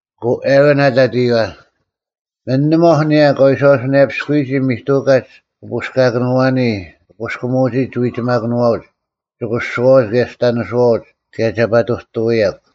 ᐊᑯ ᐊᕋᓐ ᐊᑕᑦ ᐃᔪᐛ, “ᒥᓂᒺᐧᒄ ᐊᓂᔭ ᑲ ᐎᔄᐅᓱᓇᔭᐱᔅᑯᔨᒋ ᒥᑐᑲᒡ ᑭ ᐳᔅᑲᑭᓄᐛᓂ ᑭ ᐳᔅᑭᒧᐅᒋ ᒋᐎᒋᒪᑭᓄᐛᐅᒡ, ᒋᑯᓱᐛᐅᒡ ᑭᔭ ᒋᑕᓂᓱᐛᐅᒡ ᑭᔭ ᒐ ᐸᑐᑐᐎᔭᒄ᙮”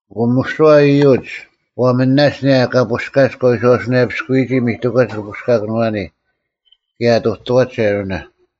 ᐊᑯ ᒥᓯᐛ ᐃᔪᒡ ᒂ ᒥᓇᒡ ᐊᓂᔭ ᑲ ᐳᔅᑲᒡ ᑲ ᐎᔄᐅᓱᓇᔭᐱᔅᑯᔨᒋ ᒥᑐᑲᒡ ᑭ ᐳᔅᑲᑭᓄᐛᓂ, ᑭᔭ ᐊᑐᑐᐛᒡ ᐊᕋᓇ᙮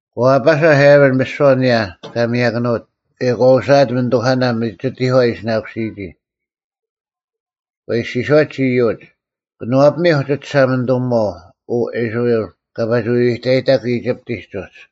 ᒂ ᐊᐸᓴᐧᒃ ᐊᕋᓐ ᒥᓯᐛ ᐊᓂᔭ ᑲ ᒥᔭᑭᓄᐅᑦ ᑭᔭ ᒂ ᐅᓯᐊᑦ ᒥᓂᑐᐧᑲᓇ ᒥᒋᑎᒂ ᐊ ᐃᓯᓇᑯᓯᔨᒋ᙮ ᒂ ᐃᔅᒋᔄᒡ ᐃᔪᒡ, “ᑭᓄᐛᐱᒥᐧᒄ ᒋ ᒋᓴᒪᓂᑐᒧᐛᐤ, ᐅ ᐃᔅᕋᐃᓪ, ᑲᒋ ᐸᒋ ᐎᐎᑕᐃᑕᒄ ᐃᒋᑉᑎᒡ ᐅᒡ᙮”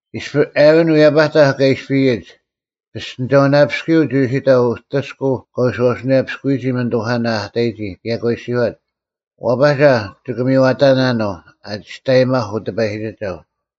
ᐃᔅᐱ ᐊᕋᓐ ᐎᔭᐸᑕᐧᒃ ᑲ ᐃᔅᐱᔨᒡ, ᐱᔅᑎᓂᒐᐅᓇᐱᔅᑯᔪᐤ ᒋ ᐅᓯᑕᐤ ᐅᑎᔅᑯᐤ ᑲ ᐎᔄᐅᓱᓇᔭᐱᔅᑯᔨᒋ ᒥᓂᑐᐧᑲᓇ ᐊ ᑕᔨᒋ ᑭᔭ ᒂ ᐃᔅᒋᔄᑦ, “ᐛᐸᒐ ᒋᑭ ᒥᔽᑕᓇᓄᐤ ᐊ ᒋᔅᑕᔨᒪᐧᒄ ᐅᑎᐸᔨᒋᒐᐤ᙮”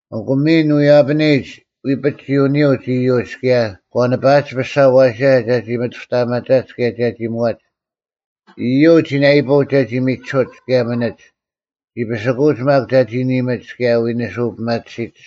ᐊᑯ ᒥᓐ ᐎᔭᐱᓂᔨᒡ ᐎᐱᒡ ᒋ ᐅᓂᐅᒡ ᐃᔪᒡ ᑭᔭ ᒂ ᓂᐸᐊᒡ ᐱᔅᒐ ᐊᐛᓯᓴ ᒐᒋ ᒥᑐᔅᑕᐊᒪᒐᒡ ᑭᔭ ᒐᒋ ᒧᐛᒡ᙮ ᐃᔪᒡ ᒋ ᓇᐃᐳᐅᒡ ᒐᒋ ᒥᒋᓱᒡ ᑭᔭ ᒥᓂᒡ, ᒋ ᐱᓯᑯᐅᒡ ᒪᒃ ᒐᒋ ᓂᒥᒡ ᑭᔭ ᐎᓂᓯᐤ ᐱᒪᑎᓯᒡ᙮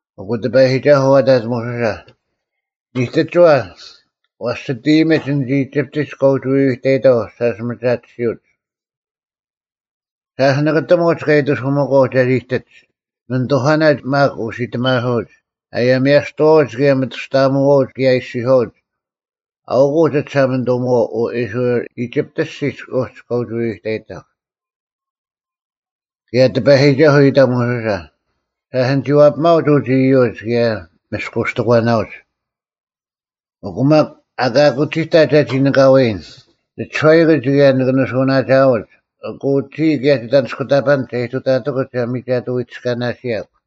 ᐊᑯ ᑎᐸᔨᒋᒐᓱᐤ ᐊᑕᑦ ᒧᓱᓴ, “ᓂᑎᒋᐛ, ᐛᔅ ᒋᑦ ᐃᔨᒥᒡ ᐊᓐᒡ ᐃᒋᑉᑎᒡ ᑲ ᐅᒋ ᐎᐎᑕᐃᑥᐤ, ᓴᔅ ᒥᒐᑎᓯᐅᒡ᙮ ᓴᔅ ᓂᑭᑎᒧᒡ ᑲ ᐃᑎᓱᐛᑎᒂᐤ ᒐ ᐃᑎᒡ, ᒥᓂᑐᐧᑲᓇ ᒪᒃ ᐅᓯᑎᒪᓱᐅᒡ, ᐊᔭᒥᐊᔅᑐᐛᐅᒡ ᑭᔭ ᒥᑐᔅᑕᐊᒧᐛᐅᒡ ᑭᔭ ᐃᔅᒋᔄᐅᒡ, ‘ᐊᐅᑯᐤ ᒋ ᒋᓴᒪᓂᑐᒧᐛᐤ, ᐅ ᐃᔅᕋᐃᓪ, ᐃᒋᑉᑦ ᐊᔅᒋᒡ ᐅᒡ ᑲ ᐸᒋ ᐎᐎᑕᐃᑕᐧᒄ᙮’” ᑭᔭ ᑎᐸᔨᒋᒐᓱᐤ ᐃᑕᐤ ᒧᓱᓴ, “ᓴᔅ ᓂᒋ ᐛᐱᒪᐅᒡ ᐅᒡ ᐃᔪᒡ ᑭᔭ ᒥᔅᑯᔅᑎᒂᓇᐅᒡ, ᐊᑯ ᒪᒃ ᐊᑲ ᑯᒋᑕ ᒐᒋ ᓂᑲᐎᔨᓐ, ᓂ ᒋᔄᐃᑯᒡ ᑭᔭ ᓂᑭ ᓂᓱᐅᓇᒋᐊᐅᒡ᙮ ᐊᑯ ᒋᔾ ᑭᔭ ᒋᑦ ᐊᓂᔅᑯᑕᐸᓐᒡ ᒐ ᐃᑐᑕᑎᑯᒡ ᒐ ᒥᒐᑐ ᐃᑎᔅᑲᓇᓯᔭᒄ᙮”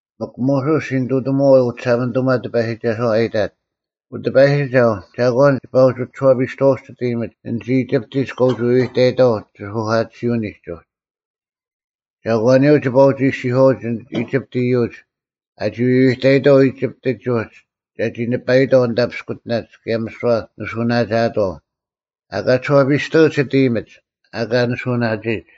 ᒥᒄ ᒧᓱᔅ ᒋ ᓂᑐᑎᒧᐛᐤ ᐅᒋᓴᒪᓂᑐᒪ ᑎᐸᔨᒋᒐᓯᐛ ᐊ ᐃᑕᑦ, “ᐅᑎᐸᔨᒋᒐᐤ, ᒐᒂᓐ ᒋᐸ ᐅᒋ ᒋᔄᐱᔅᑐᐛᐅᒡ ᒋᑦ ᐃᔨᒥᒡ, ᐊᓐᒡ ᐃᒋᑉᑎᒡ ᑲ ᐅᒋ ᐎᐎᑕᐃᑥᐤ ᒋᓱᐧᑲᑎᓯᐅᓂᒡ ᐅᒡ? ᒐᒂᓂᔪᐤ ᒋᐸ ᐅᒋ ᐃᔅᒋᔄᐅᒡ ᐃᒋᑉᑦ ᐃᔪᒡ, ᐊᒋ ᐎᐎᑕᐃᑥᐤ ᐃᒋᑉᑎᒡ ᐅᒡ ᒐᒋ ᓂᐸᐃᑥᐤ ᐊᓐᑕ ᐱᔅᑯᑎᓇᒡ ᑭᔭ ᒥᓯᐛ ᓂᓱᐅᓇᒋᐊᑥᐤ? ᐊᑲ ᒋᔄᐱᔅᑐᐅᒡ ᒋᑦ ᐃᔨᒥᒡ, ᐊᑲ ᓂᓱᐅᓇᒋᐃᒡ᙮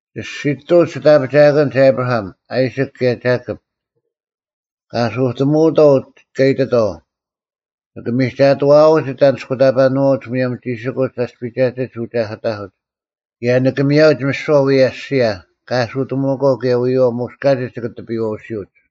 ᒋᔅᒋᑐᐅᒡ ᒋᑦ ᐊᐱᒋᐊᑭᓐᒡ ᐊᑉᕋᐊᒻ, ᐊᐃᓯᒃ ᑭᔭ ᒐᑭᑉ᙮ ᑲ ᐊᓱᑎᒧᐅᑥᐤ ᑲ ᐃᑎᑥᐤ, ‘ᓂᑭ ᒥᒐᑐᐛᐅᒡ ᒋᑦ ᐊᓂᔅᑯᑕᐸᓄᐛᐅᒡ ᒧᔭᒻ ᒋᓯᑯᒡ ᐊᔅᐱᒐᑎᒡ ᐅᒐᑭᑕᐧᑯᒡ ᑭᔭ ᓂᑭ ᒥᔭᐅᒡ ᒥᓯᐛ ᐅᔭ ᐊᔅᒋᔭ ᑲ ᐊᓱᑎᒧᐅᒂᐤ ᑭᔭ ᐎᔨᐛᐤ ᒧᔅ ᑲᒋᒡ ᒋᑭ ᑎᐱᔨᐛᓯᐅᒡ᙮’”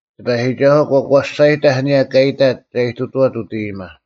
ᑎᐸᔨᒋᒐᓱᐤ ᒂ ᒂᔅᒐᔨᑕᐧᒃ ᐊᓂᔭ ᑲ ᐃᑕᑦ ᒐ ᐃᑐᑐᐛᑦ ᐅᑦ ᐃᔨᒪ᙮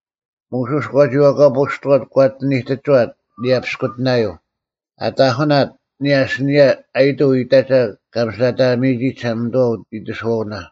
ᒧᓱᔅ ᒂ ᒋᐛᑲᐳᔅᑐᐛᑦ ᒂ ᐊᑎ ᓂᑎᒋᐛᑦ ᐊᓂᔭ ᐱᔅᑯᑎᓇᔪᐤ, ᐊ ᑕᐧᑯᓇᑦ ᐊᓂᔭ ᐊᓯᓂᔭ ᐊᔨᑐᐤ ᐃᑕᒐ ᑲ ᒥᓯᓇᑕᒥᔨᒋ ᒋᓴᒪᓂᑐᐛ ᐃᑎᓱᐛᐅᓇ᙮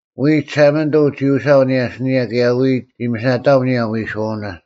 ᐎᔾ ᒋᓴᒪᓂᑐᐤ ᒋ ᐅᓯᐊᐤ ᐊᓂᔭ ᐊᓯᓂᔭ ᑭᔭ ᐎᔾ ᒋ ᒥᓯᓇᑕᐊᒻ ᐊᓂᔭ ᐎᓱᐛᐅᓇ᙮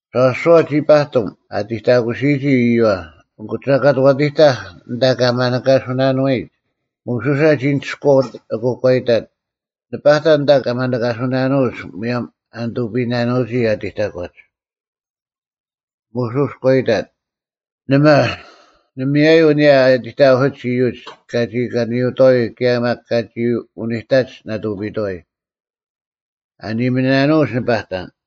ᒐᓱᐛ ᒋ ᐸᑎᒻ ᐊ ᐃᑎᑕᑯᓯᔨᒋ ᐃᔪᐛ᙮ ᐊᑯ ᒐᑲᑦ ᐛᑎᑕᐧᒃ ᐊᓐᑕ ᑲ ᒪᓂᑲᓱᓇᓄᐎᒡ, ᒧᓱᓴ ᒋᓂᒋᔅᑯᐛᐤ ᐊᑯ ᒂ ᐃᑕᑦ, “ᓂ ᐸᑕᓐ ᐊᓐᑕ ᑲ ᒪᓂᑲᓱᓇᓄᐅᒡ ᒧᔭᒻ ᐊ ᓂᑐᐱᔨᓇᓄᐅᒋ ᐊᑎᑕᒂᒡ᙮” ᒧᓱᔅ ᒂ ᐃᑕᑦ, “ᓇᒪ, ᓇᒪᔭᔪᐤ ᐊᓂᔭ ᐊ ᐃᑎᑕᑯᓯᒡ ᐃᔪᒡ ᑲᒋ ᑲᓂᔪᑥᐎ ᑭᔭ ᒪᒃ ᑲᒋ ᐅᓂᑕᒡ ᓇᑐᐱᔨᑥᐎ! ᐊ ᓂᑭᒧᓇᓄᐅᒡ ᓂᐸᑕᓐ!”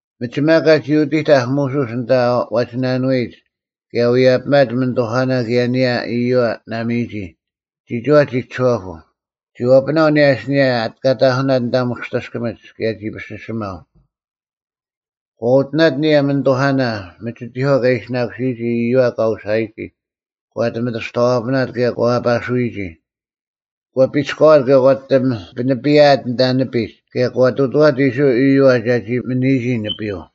ᒥᒋᒪ ᑲᒋ ᐅᑎᑕᐧᒃ ᒧᓱᔅ ᐊᓐᑕ ᐛᒋᓇᓄᐎᒡ ᑭᔭ ᐎᔭᐱᒪᑦ ᒥᓂᑐᐧᑲᓇ ᑭᔭ ᐊᓂᔭ ᐃᔪᐛ ᓇᒥᔨᒋ, ᒋᒋᐛ ᒋ ᒋᔄᐳᐤ᙮ ᒋ ᐛᐱᓇᐤ ᐊᓂᔭ ᐊᓯᓂᔭ ᑲ ᑕᐧᑯᓇᑦ ᐊᓐᑕ ᒧᔅᑎᑭᒥᒡ ᑭᔭ ᒋ ᐱᓯᓯᒪᐤ᙮ ᒂ ᐅᑎᓇᑦ ᐊᓂᔭ ᒥᓂᑐᐧᑲᓇ ᒥᒋᑎᒂ ᐊ ᐃᓯᓇᑯᓯᔨᒋ ᐃᔪᐛ ᑲ ᐅᓴᔨᒋ, ᒂ ᐊᑎ ᒥᑐᔅᑕᐛᐱᓇᑦ ᑭᔭ ᒂ ᐊᐸᓱᐎᔨᒋ᙮ ᒂ ᐱᒋᔅᑲᐛᑦ ᑭᔭ ᒂ ᐊᑎ ᐱᓂᐱᔭᐊᑦ ᐊᓐᑕ ᓂᐱᒡ ᑭᔭ ᒂ ᑐᑐᐛᑦ ᐃᔅᕋᐃᓪ ᐃᔪᐛ ᒐᒋ ᒥᓂᔨᒋ ᓂᐱᔪᐤ᙮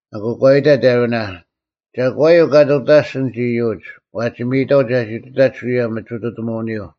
ᐊᑯ ᒂ ᐃᑕᑦ ᐊᕋᓇ, “ᒐᒂᔪᐤ ᑲ ᑐᑕᔅᒡ ᐊᓐᒡ ᐃᔪᒡ, ᐛᒋ ᒥᔨᑥᐤ ᒐᒋ ᑐᑕᒡ ᐅᔭ ᒥᒋᑐᑎᒧᐅᓂᔪᐤ?”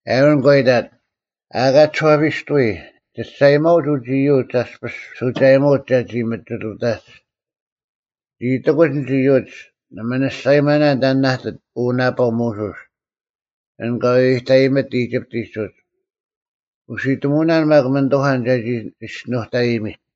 ᐊᕋᓐ ᒂ ᐃᑕᑦ, “ᐊᑲ ᒋᔄᐱᔅᑐᐎ, ᒋ ᒋᔅᒐᔨᒪᐅᒡ ᐅᒡ ᐃᔪᒡ ᐊᔅᐱᔅ ᓱᒐᔨᒧᒡ ᒐᒋ ᒥᒋᑐᑕᒡ᙮ ᓂᒋ ᐃᑎᑯᒡ ᐊᓐᒡ ᐃᔪᒡ, ‘ᓇᒪ ᓂ ᒋᔅᒐᔨᒪᓇᓐ ᑕᓐ ᐊ ᐃᑎᑦ ᐅ ᓇᐸᐤ ᒧᓱᔅ, ᐊᓐ ᑲ ᐎᐎᑕᔨᒥᑦ ᐃᒋᑉᑎᒡ ᐅᒡ, ᐅᓯᑎᒧᐅᓇᓐ ᒪᒃ ᒥᓂᑐᐧᑲᓐ ᒐᒋ ᒋᔅᒋᓄᑕᔨᒥᑦ!’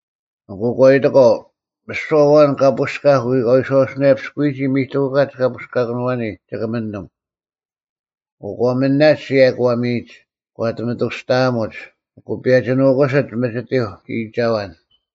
ᐊᑯ ᒂ ᐃᑎᒂᐤ, ‘ᒥᓯᐛ ᐊᐛᓐ ᑈᔅᑲᐧᒃ ᑲ ᐎᔄᐅᓱᓇᔭᐱᔅᑯᔨᒋ ᒥᑐᑲᒡ ᑭᐳᔅᑲᑭᓄᐛᓂ ᒋᑭ ᒥᓂᒻ᙮’ ᐊᑯ ᒂ ᒥᓇᒡ ᑭᔭ ᒂ ᒥᔨᒡ᙮ ᒂ ᐊᑎ ᒥᑐᔅᑕᐊᒧᒡ, ᐊᑯ ᐱᔭᒋ ᓄᑯᓯᑦ ᒥᒋᑎᐧᒄ ᐃᔨᒐᐛᓐ!”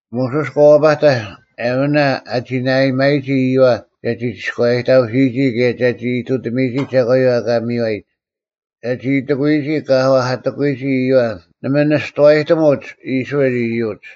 ᒧᓱᔅ ᒂ ᐛᐸᑕᐧᒃ ᐊᕋᓇ ᐊᒋ ᓇᐊᔨᒪᔨᒋ ᐃᔪᐛ ᒐᒋ ᒋᔎᔭᔨᑕᑯᓯᔨᒋ ᑭᔭ ᒐᒋ ᐃᑐᑎᒥᔨᒋ ᒐᒂᔪᐤ ᐊ ᐊᑲ ᒥᔽᔨᒡ, ᒐᒋ ᐃᑎᑯᔨᒋ ᑲ ᐛᐧᑲᑎᑯᔨᒋ ᐃᔪᐛ ᓇᒪ ᓂᔅᑐᐛᔨᑎᒧᒡ ᐃᔅᕋᐃᓪ ᐃᔪᒡ᙮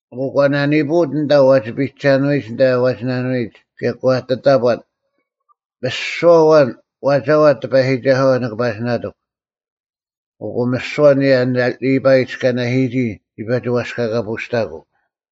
ᐊᑯ ᒂ ᓇᓂᐳᐅᑦ ᐊᓐᑕ ᐛᒋ ᐱᔨᒐᓄᐎᒡ ᐊᓐᑕ ᐛᒋᓇᓄᐎᒡ ᑭᔭ ᒂ ᐊᑎ ᑕᑈᑦ, “ᒥᓯᐛ ᐊᐛᓐ ᐛᒐᐛᑦ ᑎᐸᔨᒋᒐᓱᐛ ᓂᑭ ᐸᒋ ᓇᑎᒄ!” ᐊᑯ ᒥᓯᐛ ᐊᓂᔭ ᓕᐸᐃ ᐊ ᐃᑎᔅᑲᓇᓯᔨᒋ ᒋ ᐸᒋ ᐛᔅᑲᑲᐳᔅᑕᑯᐤ᙮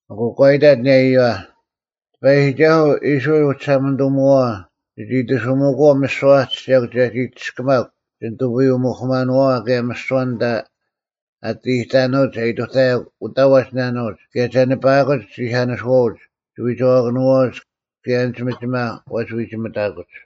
ᐊᑯ ᒂ ᐃᑕᑦ ᐊᓂᔭ ᐃᔪᐛ, “ᑎᐸᔨᒋᒐᓱᐤ ᐃᔅᕋᐃᓪ ᐅᒋᓴᒪᓂᑐᒧᐛᐛ ᒋᑦ ᐃᑎᓱᒥᑯᐛᐤ ᒥᓯᐛ ᐊ ᑎᓯᔭᒄ ᒐᒋ ᒋᔅᑭᒪᒄ ᒋᓂᑐᐱᔪᐅ-ᒧᐧᑯᒪᓄᐛᐛ ᑭᔭ ᒥᓯᐛ ᐊᓐᑕ ᐊ ᐊᑎ ᐃᑕᓄᐅᒡ ᒐ ᐃᑐᑕᔭᒄ ᐅᑕ ᐛᒋᓇᓄᐅᒡ ᑭᔭ ᒐ ᓂᐸᐊᑯᒡ ᒋᐧᑲᓂᓱᐛᐅᒡ, ᒋᐎᒐᐛᑭᓄᐛᐅᒡ ᑭᔭ ᐊᓐᒡ ᒥᒋᒪ ᐛᒋ ᐎᒋᒥᑕᑯᒡ᙮”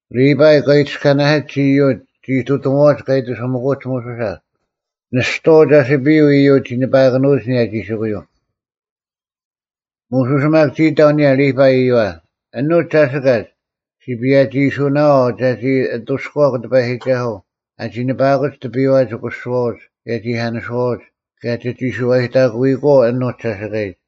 ᓕᐸᐃ ᑲ ᐃᑎᔅᑲᓇᓯᒡ ᐃᔪᒡ ᒋ ᐃᑐᑎᒺᐅᒡ ᑲ ᐃᑎᓱᒥᑯᒡ ᒧᓱᓴ, ᓂᔍᐤ ᒐᓯᐱᔪᐤ ᐃᔪᒡ ᒋ ᓂᐸᐊᑭᓄᐎᒡ ᐊᓂᔭ ᒋᓯᑯᔪᐤ᙮ ᒧᓱᔅ ᒪᒃ ᒋ ᐃᑕᐤ ᐊᓂᔭ ᓕᐸᐃ ᐃᔪᐛ, “ᐊᓄᒡ ᒐᓯᑲᒡ ᔅᒋ ᐸᔭᒋᐃᓱᓇᐛᐤ ᒐᒋ ᐊᑐᔅᑯᐛᒄ ᑎᐸᔨᒋᒐᓱᐤ ᐊᒋ ᓂᐸᐊᑯᒡ ᑎᐱᔨᐛ ᒋᑯᓱᐛᐅᒡ ᑭᔭ ᒋᐧᑲᓂᓯᐛᐅᒡ, ᑭᔭ ᒋᒋ ᓱᐛᔨᑕᑯᐃᑯᐛᐤ ᐊᓄᒡ ᒐᓯᑲᔨᒡ᙮”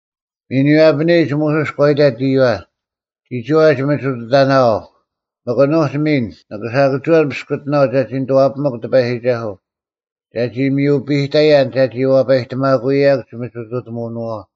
ᒥᓐ ᐎᔭᐱᓂᔨᒡ ᒧᓱᔅ ᒂ ᐃᑕᑦ ᐃᔪᐛ, “ᒋᒋᐛ ᒋᒥᒋᑐᑕᓇᐛᐤ, ᒥᒄ ᐊᓄᒡ ᒥᓐ ᓂᑭ ᓴᑭᒋᐛᓐ ᐱᔅᑯᑎᓇᐤ ᒐᒋ ᓂᑐᐛᐱᒥᒄ ᑎᐸᔨᒋᒐᓱᐤ, ᒐᒋ ᒥᔪᐱᑕᔭᓐ ᒐᒋ ᐛᐸᔨᑎᒪᑯᐅᔭᒄ ᒋᒥᒋᑐᑎᒧᐅᓄᐛᐤ᙮”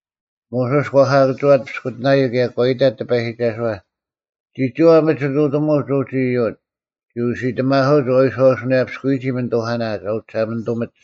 ᒧᓱᔅ ᒂ ᓴᑭᒋᐛᑦ ᐱᔅᑯᑎᓇᔪᐤ ᑭᔭ ᒂ ᐃᑕᑦ ᑎᐸᔨᒋᒐᓱᐛ “ᒋᒋᐛ ᒥᒋᑐᑎᒧᒡ ᐅᒡ ᐃᔪᒡ, ᒋ ᐅᓯᑎᒪᓱᐅᒡ ᐊ ᐎᔄᐅᓱᓇᔭᐎᒋ ᒥᓂᑐᐧᑲᓇ ᒐ ᐅᒋᓴᒪᓂᑐᒥᒡ᙮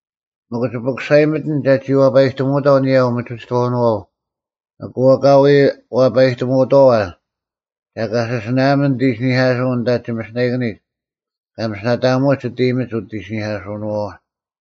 ᒥᒄ ᒋ ᐱᑯᓴᔨᒥᑎᓐ ᒐᒋ ᐛᐸᔨᑎᒧᐅᑥᐤ ᐊᓂᔭ ᐅᒥᒋᑥᐅᓄᐛᐤ, ᐊᑯ ᐊᑲ ᐎ ᐛᐸᔨᑎᒧᐅᑥᐛ ᒐ ᑲᓯᓯᓇᐊᒥᓐ ᓂᑦ ᐃᓯᓂᐧᑲᓱᐅᓐ ᐊᓐᑕ ᒋᒥᓯᓇᐃᑭᓂᒡ ᑲ ᒥᓯᓇᑕᐅᒧᑦ ᒋᑦ ᐃᔨᒥᒡ ᐅᑦ ᐃᓯᓂᐧᑲᓱᓄᐛᐛ᙮”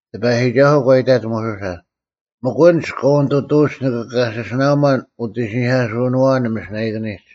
ᑎᐸᔨᒋᒐᓱᐤ ᒂ ᐃᑕᑦ ᒧᓱᓴ, “ᒥᒄ ᐊᓐᒡ ᑲ ᐅᓂᑐᑐᐅᒡ ᓂᑭ ᑲᓯᓯᓇᐊᒺᓐ ᐅᑦ ᐃᓯᓂᐧᑲᓱᐅᓄᐛᐛ ᓂᒥᓯᓇᐃᑭᓂᒡ᙮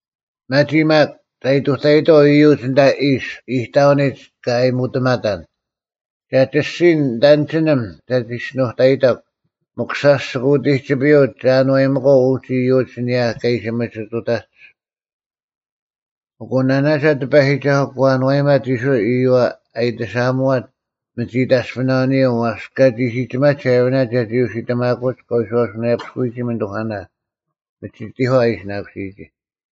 ᒪᒋ ᒪᒃ ᒐ ᐃᑐᑕᐃᑥᐤ ᐃᔪᒡ ᐊᓐᑕ ᐃᔅ ᐃᑕᐅᓂᒡ ᑲ ᐊᔨᒧᑎᒪᑕᓐ, ᒐ ᒋᔅᒋᔨᓐ ᓂᑦ ᐊᓐᒋᓂᒻ ᒐ ᒋᔅᒋᓄᑕᔨᑕᒄ᙮ ᒥᒄ ᓴᔅ ᒋᑭ ᐅᑎᒋᐱᔪᐤ ᒐ ᐊᓏᔨᒥᒂᐤ ᐅᒡ ᐃᔪᒡ ᐊᓂᔭ ᑲ ᐃᓯ ᒥᒋᑐᑎᒡ᙮” ᐊᑯ ᓇᓇᒐ ᑎᐸᔨᒋᒐᓱᐤ ᒂ ᐊᓏᔨᒪᑦ ᐃᔅᕋᐃᓪ ᐃᔪᐛ ᐊ ᐃᑎᓴᐊᒧᐛᑦ ᒥᒋ ᐃᑕᔅᐱᓇᐅᓂᔪᐤ ᐛᔅ ᑲᒋ ᓯᒋᒪᒡ ᐊᕋᓇ ᒐᒋ ᐅᓯᑎᒪᑯᒡ ᑲ ᐎᔄᐅᓱᓇᔭᐅᔨᒋ ᒥᓂᑐᐧᑲᓇ ᒥᒋᑎᒂ ᐊ ᐃᓯᓇᑯᓯᔨᒋ᙮